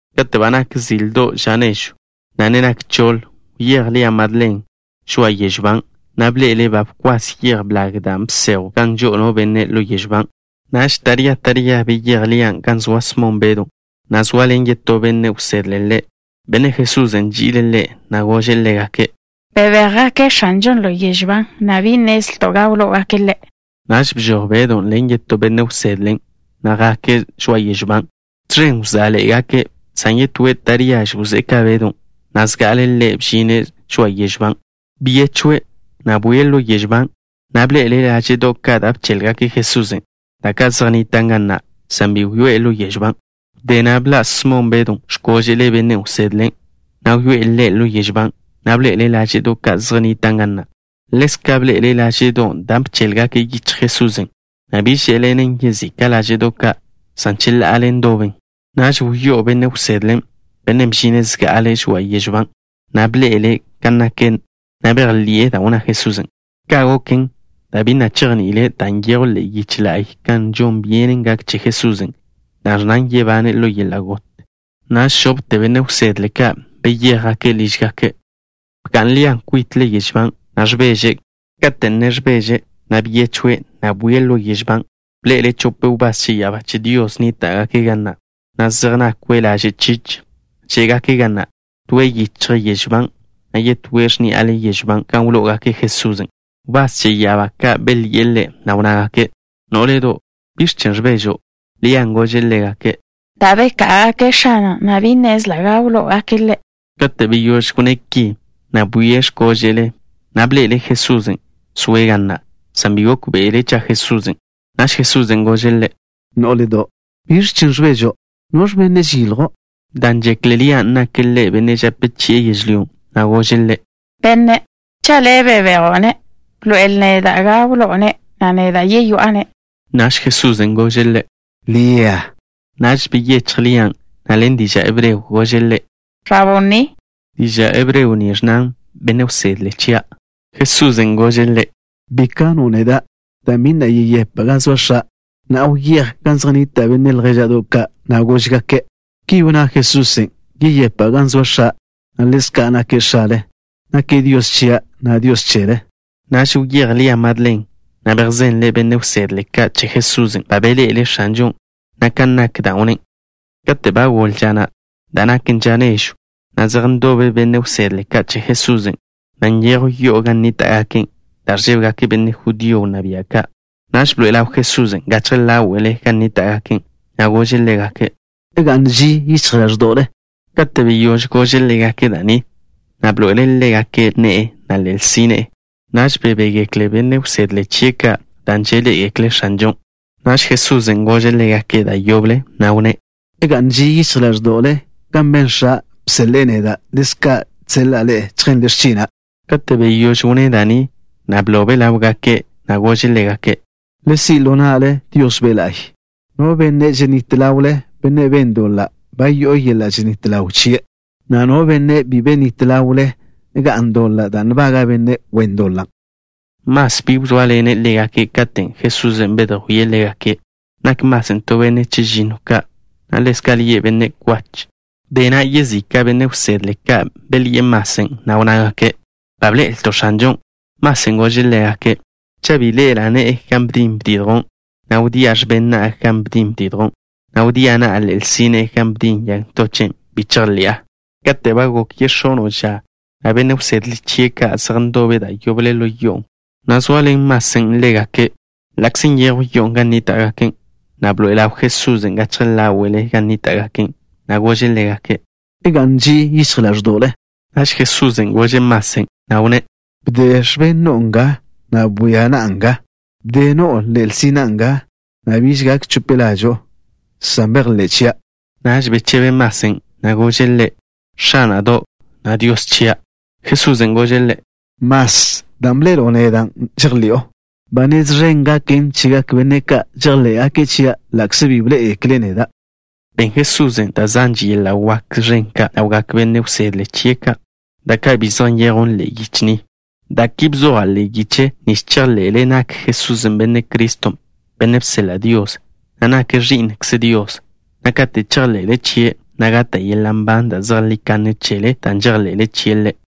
Kate' ba nak zildo' ža nežw, na' ne nak choḻ, wyéj Lia Madlen žoa'a yežw ban', na' bḻe'ele' ba bkwas yej blag da' bsejwn gan žo'o no benne' ḻo yežw ban'. Naž taría taría beyéj Lian' gan zoa Smon Bedw, na' zoaḻen yetó benne' wsedle ḻe', bennen' Jesusen' nži'ile' ḻe', na' gože' ḻégake': —¡Bebéjgake' X̱anžon' ḻo yežw ban', na' bi nnezlto' gan wló'ogake' Ḻe'! Naž bžoj Bedon' ḻen yetó benne' wsedlen', na' jake' žoa'a yežw ban'. Tẕen wzá'ḻe'egake', san yetóen' taríaže wzé'e ka Bedon', na' zga'ale' ḻe' bžine' žoa'a yežw ban'. Byechwe', na' bwie' ḻo yežw ban', na' bḻe'ele' láže'do' ka' da' bchéḻgaken' Jesusen', da' ka' zej nnitan' ga na', san bi wyoé'e ḻo yežw ban'. Wdé na' bḻa' Smon Bedon' x̱kóže'le benne' wsedlen', na' wyoé'e ḻe' ḻo yežw ban', na' bḻe'ele' láže'do' ka' zej nnitan' ga na'. Ḻezka' bḻe'ele' láže'don' da' bchéḻgaken' yichj Jesusen', na' bi žé'ḻenen yezika' láže'do' ka', san cheḻa'ale ndoben. Naž wyó'o benne' wsedlen', bennen' bžine' zga'ale' žoa'a yežw ban', na' bḻe'ele' kan naken, na' bejḻi'e da' wnná Jesusen'. Ka' goken, dan' bi na' chejni'ile' da' nyejw ḻe'e yiche la'y kan žon byenen gaken che Jesusen', da' ẕnnan yebane' ḻo yeḻa' got. Naž žopte benne' wsedle ka' beyéjgake' lížgake'. Bga'n Lia kwitle yežw ban', na' ẕbeže'. Kate' ne ẕbeže', byechwe', na' bwie' ḻo yežw ban'. Bḻe'ele' chope wbás che ya'abá che Dios nníta'gake' ga na', na' zej nakwe' laže' chich. Žé'gake' ga na', toe' yichjle yežw ban', na' yetóe' x̱ní'ale yežw ban' gan wló'ogake' Jesusen'. Wbás che ya'abá ka' belyi'e ḻe', na' wnnágake': —Nó'ledo', ¿biẕ chen' ẕbežo'? Lian' gože' ḻégake': —Dan' beká'agake' X̱ana', na' bi nnezla' gan wló'ogake' Ḻe'. Kate' beyóž wnné' ki, bwie' x̱kóže'le', na' bḻe'ele' Jesusen', zoe' ga na', san bi gókbe'ele' cha' Jesusen'. Naž Jesusen' gože' ḻe': —Nó'ledo', ¿biẕ chen' ẕbežo'? ¿Noẕ benne' žeyiljo'? Dan' žekle Lian' nake' Ḻe' benne' žape chi'e yežlyón', na' gože' Ḻe': —Benne', cha' le' bebejo'-ne', bḻoe'el neda' gan wló'o-ne', na' neda' yeyoá'a-ne'. Naž Jesusen' gože' ḻe': —Lia. Naž byechj Lian', na' ḻen diža' hebreo gože' Ḻe': —Raboní. Diža' hebreo ni ẕnnan: “Benne' Wsedle chia'.” Jesusen' gože' ḻe': —Bi kano' neda', dan' bi na' yeyepa' gan zoa X̱a'. Na'a, wyéj gan zej nnita' benne' ljéža'do' ka', na' gož-gake': “Ki wnná Jesusen': yeyepa' gan zoa X̱a', na' ḻezka' nake' X̱ale. Nake' Dios chia', na' Dios chele.” Naž wyéj Lia Madlen', na' bejzenle' benne' wsedle ka' che Jesusen' ba beḻe'ele' X̱anžon', na' kan nak dan' wnné'. Kate' ba goḻe ža na', da' naken ža nežw, zej ndobe benne' wsedle ka' che Jesusen', na' nyejw yo'o gan nníta'gake' dan' ẕžébegake' benne' judío wnná bia' ka'. Naž bḻoe'e ḻaw Jesusen' gachje ḻáwe'le gan nníta'gake', na' gože' ḻégake': —Ga'n ži yichj ḻáẕdo'le. Kate' beyóž gože' ḻégake' da' ni, bḻoe'ele' ḻégake' ne'e, na' ḻe'el sine'e. Naž bebégekle benne' wsedle chie' ka' dan' žeḻé'egekle' X̱anžon'. Naž Jesusen' gože' ḻégake' da' yoble, na' wnné': —Ga'n ži yichj ḻáẕdo'le. Kan ben X̱a', bseḻe'e neda', ḻezka' žseḻa'a ḻe'e chjenle x̱china'. Kate' beyóž wnné' da' ni, blobe' ḻáwgake', na' gože' ḻégake': —Le si' ḻo na'le Dios Be' La'y. No benne' yenít ḻawle, bennen' ben doḻa', ba yo'o yeḻa' ženít ḻaw chie', na' no benne' bi yenít ḻawle ḻe', ga'n doḻa' da' nbaga' benne' wen doḻan'. Mas bi wzóaḻene' ḻégake' katen' Jesusen' bedjwíe' ḻégake'. Nak Masen' to benne' chežinnoe' ka', na' ḻezka' lie' Benne' Kwach. Wdé na' yezika' benne' wsedle ka' belyi'e Masen', na' wnnágake': —Ba bḻe'elto' X̱anžon'. Masen' gože' ḻégake': —Cha' bi ḻe'ela' ne'e gan bdin bdidjwn', na' wdía' x̱ben na'a gan bdin bdidjwn', na' wdía' na'a ḻe'el sine'e gan bdin yag ntochen', bi chejḻi'a. Kate' ba gok yex̱ono' ža, benne' wsedle chie' ka' zej ndobe' da' yoble ḻo yo'on', na' zoaḻen Masen' ḻégake'. Ḻa'kze nyejw yo'o gan nníta'gake', bḻoe'e ḻaw Jesusen' gachje ḻáwe'le gan nníta'gake', na' gože' ḻégake': —Ga'n ži yichj ḻáẕdo'le. Naž Jesusen' gože' Masen', na' wnné': —Bde x̱ben no'o nga, na' bwia na'a nga. Bde no'o ḻe'el sina'a nga, na' biž gak chope ḻažo'o, san bejḻé' chia'. Naž bechebe Masen', na' gože' Ḻe': —X̱ána'do', na' Dios chia'. Jesusen' gože' ḻe': —Mas, dan' bḻe'elo' neda', žejḻi'o. Ba nez ẕen gaken chegak benne' ka' chejḻé'gake' chia' ḻa'kze bi ḻé'egekle' neda'. Ben Jesusen' da' zanže yeḻa' wak ẕen ka' ḻawgak benne' wsedle chie' ka', da' ka' bi zej nyejwn ḻe'e yiche ni. Da' ki bzoja' ḻe'e yiche nich chejḻe'le nak Jesusen' Benne' Criston', Bennen' bseḻa' Dios, na' nake' Ẕi'nkze Dios, na' kate' chejḻe'le chie', gata' yeḻa' nban da' zejlí kanne chele dan' žejḻe'le chie' Ḻe'.